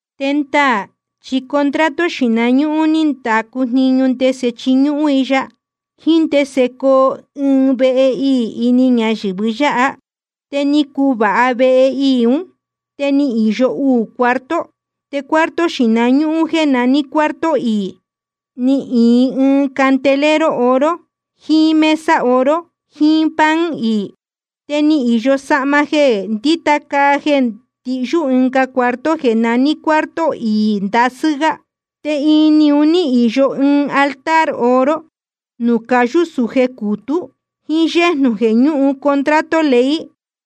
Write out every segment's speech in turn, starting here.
Te ndaā chi contrato xīhna ñúhún ní ndacu jniñu ndese chiñúhún i ya, jíín ndese coo ɨɨn vehe iī ini ñayɨ̄vɨ yáha. Te ni cuvāha vehe iī ún, te ni īyo uū cuarto. Te cuarto xīhna ñúhún jéē naní cuarto iī, ni īin candelero oro jiín mesa oro jiín pan iī. Te ni īyo sahma jeē ndíta caa jeē ndihyú ɨnga cuarto jeē naní cuarto iī ndasɨ́ gá. Te ini un ní īyo ɨɨn altar oro nuū cayú sūje cūtú, jíín yéjnū jeē ñúhun contrato ley,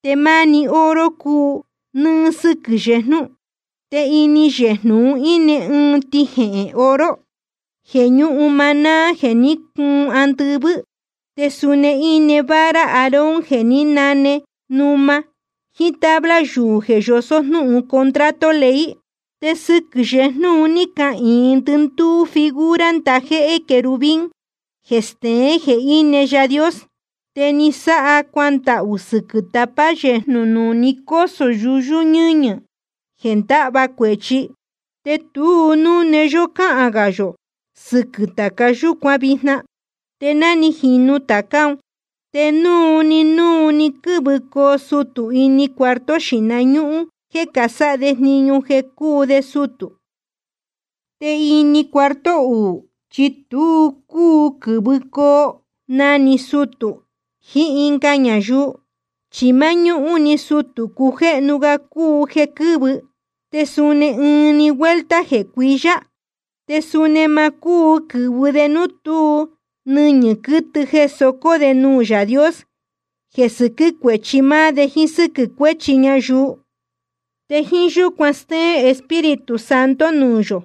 te máni oro cúu nɨ́ɨ́ sɨ́quɨ̄ yejnú. Te ini yejnū un íne ɨɨn tijehēn oro jeē ñúhun maná jeē ní cuun andɨvɨ́. Te suni íne vara Aarón jeē ní nane numa, jíín tabla yuū jeē yosó jnúhun contrato ley. Te sɨquɨ̄ yejnú un ní cahīin ndɨndúú figura ndajéhé querubín jeē steén jeē íne Yaā Dios. Te ni sáha cuandahū sɨquɨ̄ tapa yejnū nuū ni cósō yuyú nɨ́ñɨ̄ jeē ndáhva cuēchi. Te tu núne yó cáhān gā yō sɨquɨ̄ tāca yúcuan vijna. Te ná ni jīnu tācá un, te núu‑ni núu‑ni quɨ́vɨcoo sutū ini cuarto xīhna ñúhún jéē casáha de jniñu jeē cúu de sutū. Te ini cuarto uū, chi tu cúu quɨ̄vɨcoo na‑ni sutū jiín ɨnga ñayuu, chi máñúhún‑ni sutū cujéhnu ga cúu jeē quɨ́vɨ, te suni ɨɨn‑ni vuelta jeē cuiyá. Te suni ma cúu quɨ̄vɨ de núu tú nɨñɨ̄ quɨtɨ jeē socó de nuū Yaā Dios jeē sɨquɨ́ cuéchi máá de jíín sɨ́quɨ̄ cuéchi ñayuu. Te jíín yúcuan stéén Espíritu Santo nuū yō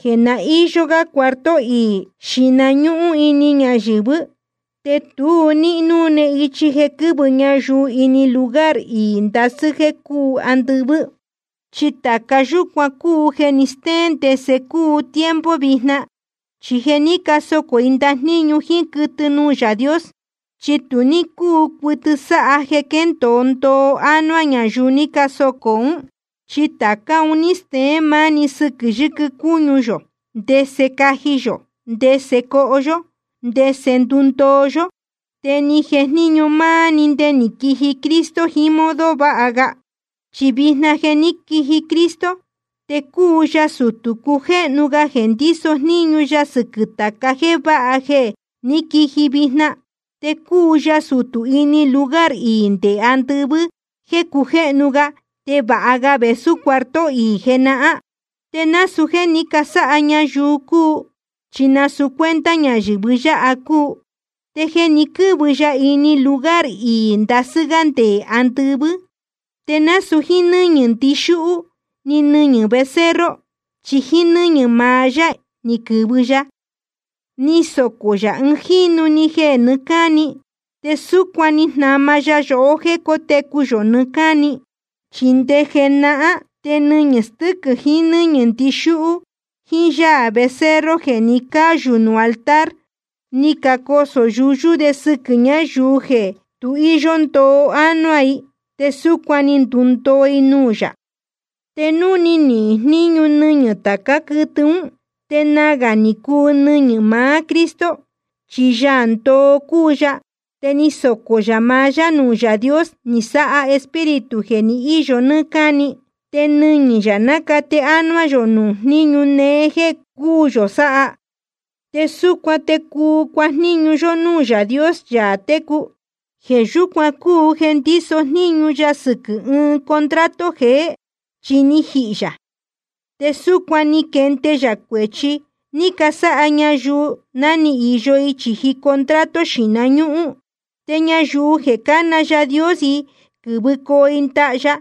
jeē ná ni īyo ga cuarto iī xīhna ñúhún ini ñayɨ̄vɨ́, te tu ní núne ichi jeē quɨ́vɨ ñayuu ini lugar iī ndasɨ́ jeē cúu andɨvɨ́. Chi tāca yúcuan cúu jeē ni stéén ndese cúu tiempo vijna. Chi jeē ní casocō i ndajníñu jíín quɨtɨ nuū Yaā Dios, chi tu ní cúu cuɨtɨ sáha jeē quéndōo ndoo ánuá ñayuu ní casocō ún. Chi tācá un ní steén máni sɨquɨ̄ yɨquɨ cúñu yō, ndese caji yō, ndese coho yó, ndese ndundoo yó. Te ni jejníñu máá‑ni nde ni quiji Cristo jiín ɨɨn modo vāha ga. Chi vijna je ni quiji Cristo, te cúu ya sutū cujéhnu ga jeē ndíso jníñu ya sɨquɨ̄ tāca jéē váha jeē ní quiji vijna. Te cúu ya sutū ini lugar iī nde andɨvɨ́ jéē cujéhnu ga te vāha ga vēsú cuarto iī jenahán. Te nasūu jéē ní casáha ñayuu cúu, chi nasūu cuenta ñayɨ̄vɨ yáha cúu. Te jeē ni quɨ́vɨ ya ini lugar iī ndasɨ́ gá nde andɨvɨ́, te nasūu jíín nɨ́ñɨ̄ ndixúhú ni nɨñɨ̄ becerro, chi jíín nɨ́ñɨ̄ maá yá ni quɨ̄vɨ ya, ni socō yā ɨɨn jínu‑ni jeē nɨɨ́ cáni. Te súcuan ni jnama ya yohó jéē cótecu yō nɨɨ́ cáni. Chi nde jenahán te nɨñɨ̄ stɨ́quɨ̄ jiín nɨ́ñɨ̄ ndixúhú jiín yáā becerro jeē ni cáyū nuū altar, ni cacosō yuyú de sɨquɨ̄ ñáyuu jeē tu íyó ndoo ánuá i, te súcuan ni ndundoo i nuū yā. Te núu ni nihīn jníñu nɨñɨ̄ tācá quɨtɨ ún, te nagā ni cuu nɨñɨ̄ maá Cristo. Chi Yaā ndoo cúu ya, te ni socō yā maá yá nuū Yaā Dios, ni sáha Espíritu jeē iyó nɨ́ɨ́ cáni. Te nɨñɨ̄ yā nácate ánuá yō nuū jníñu néé jéē cúū yō sáha. Te súcuan te cuu cuajníñu yó núū Yaā Dios, Yaā técu. Jeē yúcuan cúu jeē ndíso jníñu ya sɨquɨ̄ ɨɨn contrato jeé. Chi ni jihī yā, te súcuan ni quende yā cuēchi ni casáha ñayuu ná ni īyo i chīji contrato xīhna ñúhún. Te ñayuu jeē cána Yaā Dios i quɨ́vɨcoo i ndaha ya,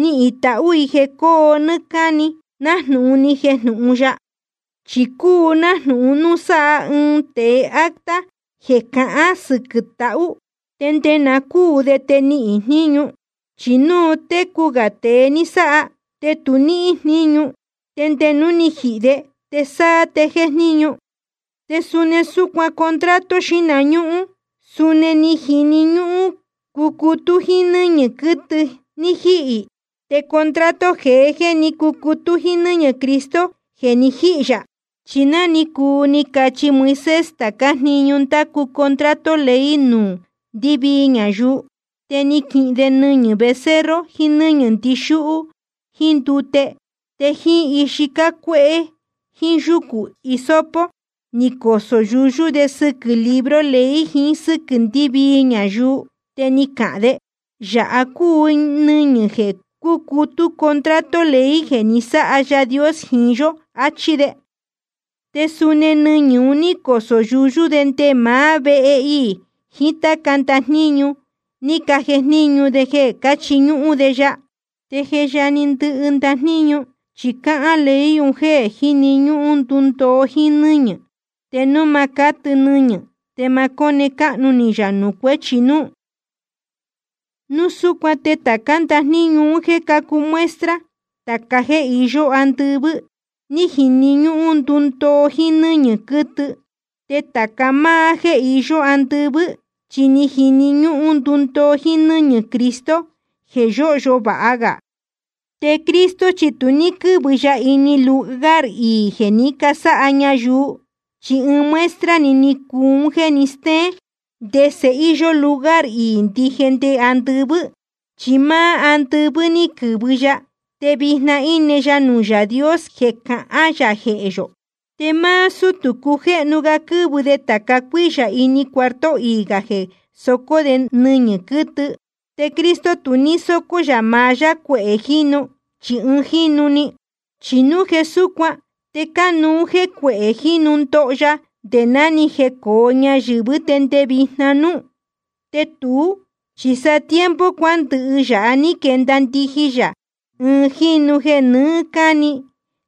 nihīn i tahū i jeē cóo nɨ́ɨ́ cáni, nájnūhun ni jejnūhun ya. Chi cúu nájnūhun núu sáha ɨɨn tēe acta jeē cahán sɨquɨ̄ tahū, te nde na cúū de te níhín jníñu. Chi núu técu gā tēe ni sáha, te tu níhín jníñu. Te nde núu ni jihī de, te sáá te jéjníñu. Te suni súcuan contrato xīhna ñúhún, suni ni jini ñúhún cucutú jíín nɨ́ñɨ̄ quɨtɨ ní jíhī. Te contrato jeé chi ni cucutú jíín nɨ́ñɨ̄ Cristo jeē ni jíhī yā. Chi ná ni cuu ni cachi Moisés tācá jniñu ndácu contrato ley un núū ndɨvii ñayuu, te ni quihin de nɨñɨ̄ becerro jiín nɨ́ñɨ̄ ndixúhú jíín ndute, te jíín ixi cácuéhé jíín yúcū hisopo ni cosō yuyú de sɨquɨ̄ libro ley jiín sɨ́quɨ̄ ndɨvii ñayuu. Te ni cahān de: Yāha cúu nɨñɨ̄ jeē cúcutú contrato ley jeē ní sáha Yaā Dios jiín yó, achí de. Te suni nɨñɨ̄ un ní cosō yuyú de nde maá vehe iī jiín táca ndajníñu ni cajejníñu de jeē cáchiñúhún de ya. Te je yajni ndɨhɨ ndajníñu, chi cáhán ley un jeē jíni ñúhún ndundoo jíín nɨ́ñɨ̄. Te núu ma cátɨ nɨñɨ̄ te ma cóne cáhnu ni yā nuū cuéchi núú. Núu súcuan te tācá ndajníñu un jéē cácuu muestra tāca jéē iyó andɨvɨ́, ni jini ñúhún ndundoo jíín nɨ́ñɨ̄ quɨtɨ. Te tāca máá jéē iyó andɨvɨ́, chi ni jini ñúhún ndundoo jíín nɨ́ñɨ̄ Cristo jeē yóhyo vāha ga. Te Cristo chi tu ní quɨ́vɨ ya ini lugar iī jeē ní casáha ñayuu, chi ɨɨn muestra‑ni ni cuu un jéē steén ndese íyó lugar iī ndije nde andɨvɨ́. Chi máá andɨvɨ́ ní quɨ̄vɨ ya, te vijna íne ya nuū Yaā Dios jeē cahán yā jehē yō. Te máá sútū cujéhnu ga quɨ́vɨ de tāca cuíyā ini cuarto iī gā jeē socó de nɨñɨ̄ quɨtɨ. Te Cristo tu ní sócó yā maá yá cuehē jínu, chi ɨɨn jínu‑ni. Chi núu jeē súcuan te cánuú jéē cuehē jínu ndoho ya nde ná ni jecōo ñayɨ̄vɨ́ te nde vijna núú. Te tuú chi sa tiempo cuándɨhɨ yāhá ni quenda ndijin yā ɨɨn jínu‑ni jeē nɨɨ́ cáni,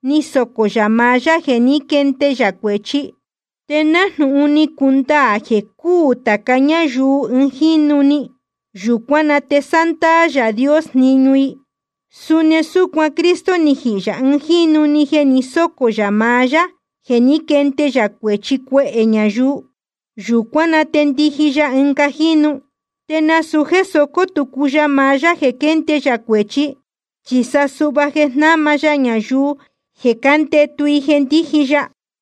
ni socō yā maá yá jeē ní quende yā cuēchi. Te nájnūhun ni cundaā jeē cúū tāca ñáyuu ɨɨn jínu‑ni, yūcuán na te sándaā Yaā Dios jniñu i, suni súcuan Cristo ni jihī yā ɨɨn jínu‑ni jeē ni sócō yā maá yá jeē ní quende yā cuēchi cuehē ñayuu. Yūcuán na te ndiji ya ɨnga jínu, te nasūu jéē socó tucu ya maá yá jeē quénde yā cuēchi, chi sa suhva jeē jnáma ya ñayuu jeē cándetu i jeē ndíji ya.